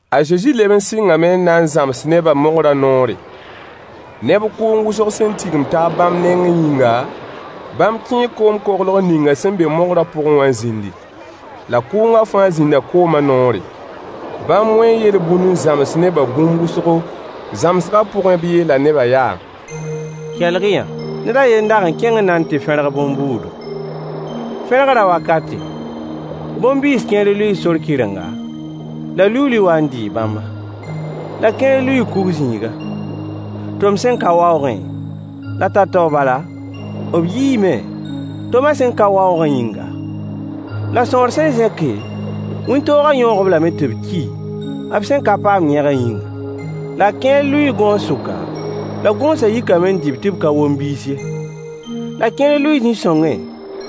A Zezi leb n sɩngame n na n zãms nebã mogrã noore. Neb kʋʋng wʋsg sẽn tigim taab bãmb nengẽ yĩnga, bãmb kẽe koom-koglg ninga sẽn be mogrã pʋgẽ wã n zĩndi. La kʋʋngã fãa zĩnda koomã noore. Bãmb wẽe yel-bũn n zãms nebã bũmb wʋsgo. Zãmsgã pʋgẽ b yeela nebã yaa: Kelg-y-yã! Ned a yen n da kẽng n na n tɩ fẽrg bõn-buudu. Fẽrgrã wakate, bõn-biis kẽer lʋɩɩ sor kɩrenga, la liuuli waa n dɩɩ bãmba. La kẽer lʋɩɩ kug zĩiga, tom sẽn ka waoogẽ, la tao-tao bala, b yiime, tomã sẽn ka waoogã yĩnga. La sõor sẽn zẽke, wĩntoogã yõog-b lame tɩ b ki, b sẽn ka paam yẽgã yĩnga. La kẽer lʋɩɩ gõos sʋka, la gõosã yikame n dɩ-b tɩ b ka wom biis ye. La kẽer lʋɩɩ zĩ-sõngẽ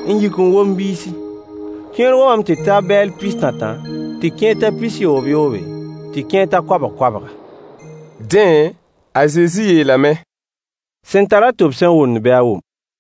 n yik n wom biisi. Kẽer womame tɩ ta bɛɛl pis-tãtã, tɩ kẽer ta pis-yoobyoobe, tɩ kẽer ta koabg-koabga. Dẽ, a Zezi yeelame: Sẽn tar-a tʋb sẽn wʋmd bɩ a wʋm.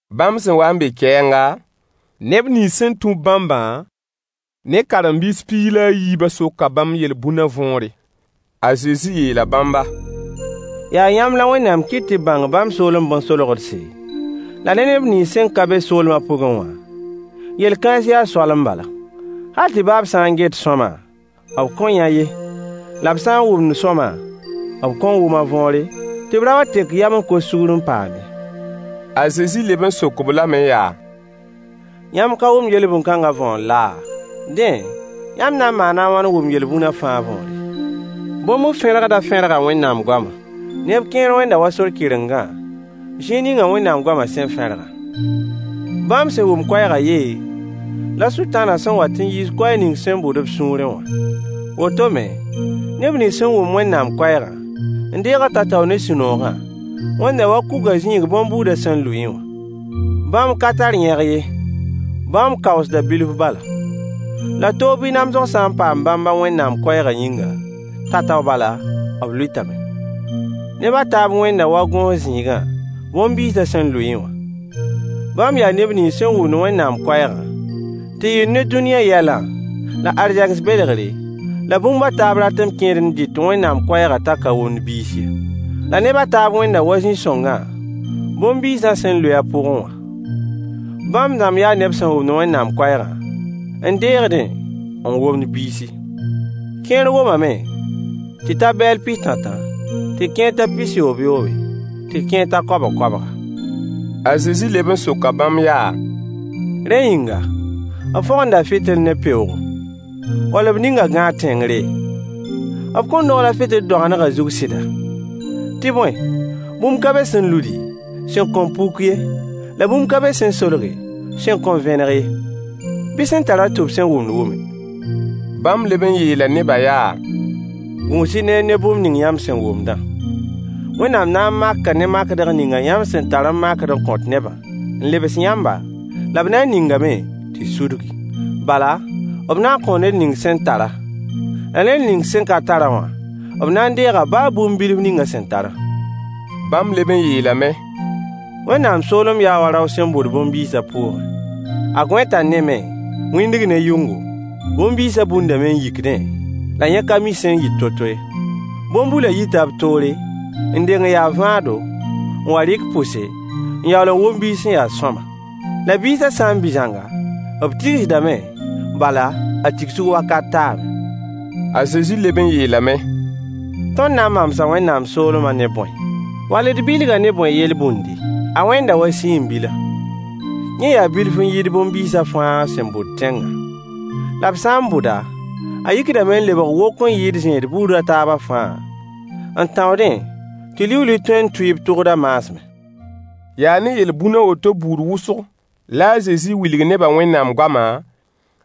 Bãmb sẽn wa n be kɛɛnga, neb nins sẽn tũ-b bãmbã ne karen-biis piig la a yiibã soka bãmb yel-bũnã võore. A Zezi yeela bãmba: Yaa yãmb la Wẽnnaam kɩt tɩ y bãng bãmb soolem bõn-solgdse, la ne neb nins sẽn ka be soolmã pʋgẽ wã, yel-kãens yaa soalem bala, “hal tɩ baa b sã n get sõama, b kõn yã ye, la b sã n wʋmd sõama, b kõn wʋm a võore, tɩ b ra wa n tek yam n kos sugr n paam ye.” A Zezi leb n sok-b lame yaa: Yãmb ka wʋmd yel-bũn-kãnga võor laa? Dẽ, yãmb na n maana a wãn n wʋm yel-bũnã fãa võore? Bõn-bu-fẽrgdã fẽrga Wẽnnaam goama. Neb kẽer wẽnda wa sor kɩrengã, zĩig ning Wẽnnaam goama sẽn fẽrgã. Bãmb sẽn wʋm koɛɛgã yee, la Sʋtãanã sẽn wat n yiis koɛɛg ning sẽn bʋd b sũurẽ wã. Woto me, neb nins sẽn wʋm Wẽnnaam koɛɛgã n deeg-a tao-tao ne sũ-noogã wẽnda wa kugã zĩig bõn-buudã sẽn lʋɩẽ wã. Bãmb ka tar yẽg ye, bãmb kaoosda bilf bala. La toog bɩ namsg sã n paam bãmba Wẽnnaam koɛɛgã yĩnga, tao-tao bala, b lʋɩtame. Neb a taab wẽnda wa gõos zĩigã bõn-biisã sẽn lʋɩẽ wã. Bãmb yaa neb nins sẽn wʋmd Wẽnnaam koɛɛgã, tɩ yɩɩr ne dũniyã yɛlã, la arzegs belgre, la bũmb a taab ratem kẽedẽ n dɩt Wẽnnaam koɛɛgã t'a ka womd biis ye. La neb a taab wẽnda wa zĩ-sõngã bõn-biisã sẽn lʋɩ a pʋgẽ wã. Bãmb dãmb yaa neb sẽn wʋmd Wẽnnaam koɛɛgã n deegdẽ n womd biisi. Kẽer womame tɩ ta bɛɛl pis-tãtã, tɩ kẽer ta pis-yoobyoobe, tɩ kẽer ta koabg-koabga. A Zezi leb n soka bãmb yaa: Rẽ yĩnga, b fõgenda fɩtɩl ne peoogo, wall b ning-a gãag tẽngre? B kõn dogl-a fɩtɩl doagendgã zug sɩda? Tɩ bõe, bũmb ka be sẽn ludi, sẽn kõn puk ye, la bũmb ka be sẽn solge, sẽn kõn vẽneg ye. Bɩ sẽn tar-a tʋb sẽn wʋmd wʋme. Bãmb leb n yeela neba yaa: Gũus-y neer ne bũmb ning yãmb sẽn wʋmdã. Wẽnnaam na n maka ne makdg ninga yãmb sẽn tar n makd n kõt nebã n lebs yãmba, la b na n ningame tɩ sudgi. Bala, b na n kõo ned ning sẽn tar-a, la ned ning sẽn ka tar-a wã, b na n deega baa bũmb bilf ning a sẽn tarã. Bãmb leb n yeelame: Wẽnnaam soolem yaa wa rao sẽn bʋd bõn-biis a pʋʋgẽ. A gõe t'a ne me, wĩndg ne yʋngo, bõn-biisã bundame n yikdẽ, la yẽ ka mi sẽn yɩt to-to ye. Bõn-bulã yita b toore, n deng n ya vãado, n wa rɩk pʋse, n yaool n wom biis sẽn ya sõama. La biisã sã n bɩ zãnga, b tigsdame, bala, a tigsg wakat taame. A Zezi leb n yeelame: Tõnd na n mamsa Wẽnnaam soolemã ne bõe, wall d bilg-a ne bõe yel-bũndi? A wẽnda wa siin-bila. Yẽ yaa bilf n yɩɩd bõn-biisã fãa sẽn bʋt tẽngã. La b sã n bʋd-a, a yikdame n lebg wok n yɩɩd zẽed buud a taabã fãa, n tãoodẽ tɩ liuuli tõe n tʋɩ b tʋgd a maasmẽ. Yaa ne yel-bũn a woto buud wʋsg la a Zezi wilg nebã Wẽnnaam goamã,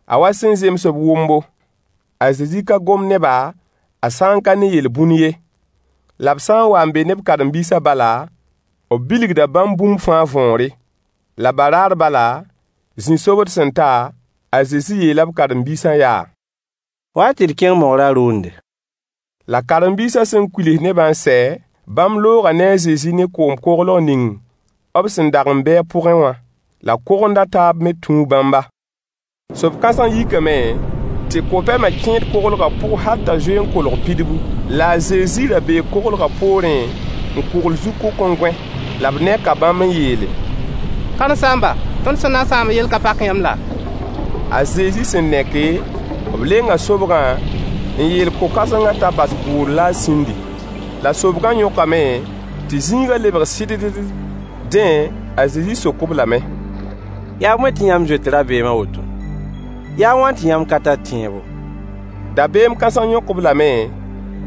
a wa sẽn zems b wʋmbo. A Zezi ka gom ne-ba, a sã n ka ne yel-bũn ye. La b sã n wa n be ne b karen-biisã bala, b bilgda bãmb bũmb fãa võore. La baraar bala, zĩ-sobd sẽn ta, a Zezi yeela b karen-biisã yaa: Wa-y tɩ d kẽng mogrã rʋʋnde. La karen-biisã sẽn kuils nebã n sɛ, bãmb looga ne a Zezi ne koom-koglg ning b sẽn dag n be a pʋgẽ wã. La kogond a taab me tũu bãmba. Sob-kãseng yikame tɩ ko-pɛma kẽed koglgã pʋg hal t'a zoe n kolg pidbu. La a Zezi ra bee koglgã poorẽ n kʋgl zu-kʋk n gõe. La b neka bãmb n yeele: Karen-saamba, tõnd sẽn na n sãamã yell ka pak yãmb laa? A Zezi sẽn neke, b lenga sobgã, n yeel ko-kãsengã t'a bas bʋʋr la a sĩndi! La sobgã yõkame tɩ zĩigã lebg sɩddd. Dẽ, a Zezi sok-b lame: Yaa bõe tɩ yãmb zoet rabeem a woto? Yaa a wãn tɩ yãmb ka tar tẽebo? Dabeem kãseng yõk-b lame,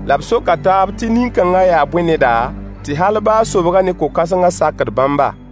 la b soka taab tɩ nin-kãnga yaa bõe neda, tɩ hal baa sobgã ne ko-kãsengã sakd bãmba?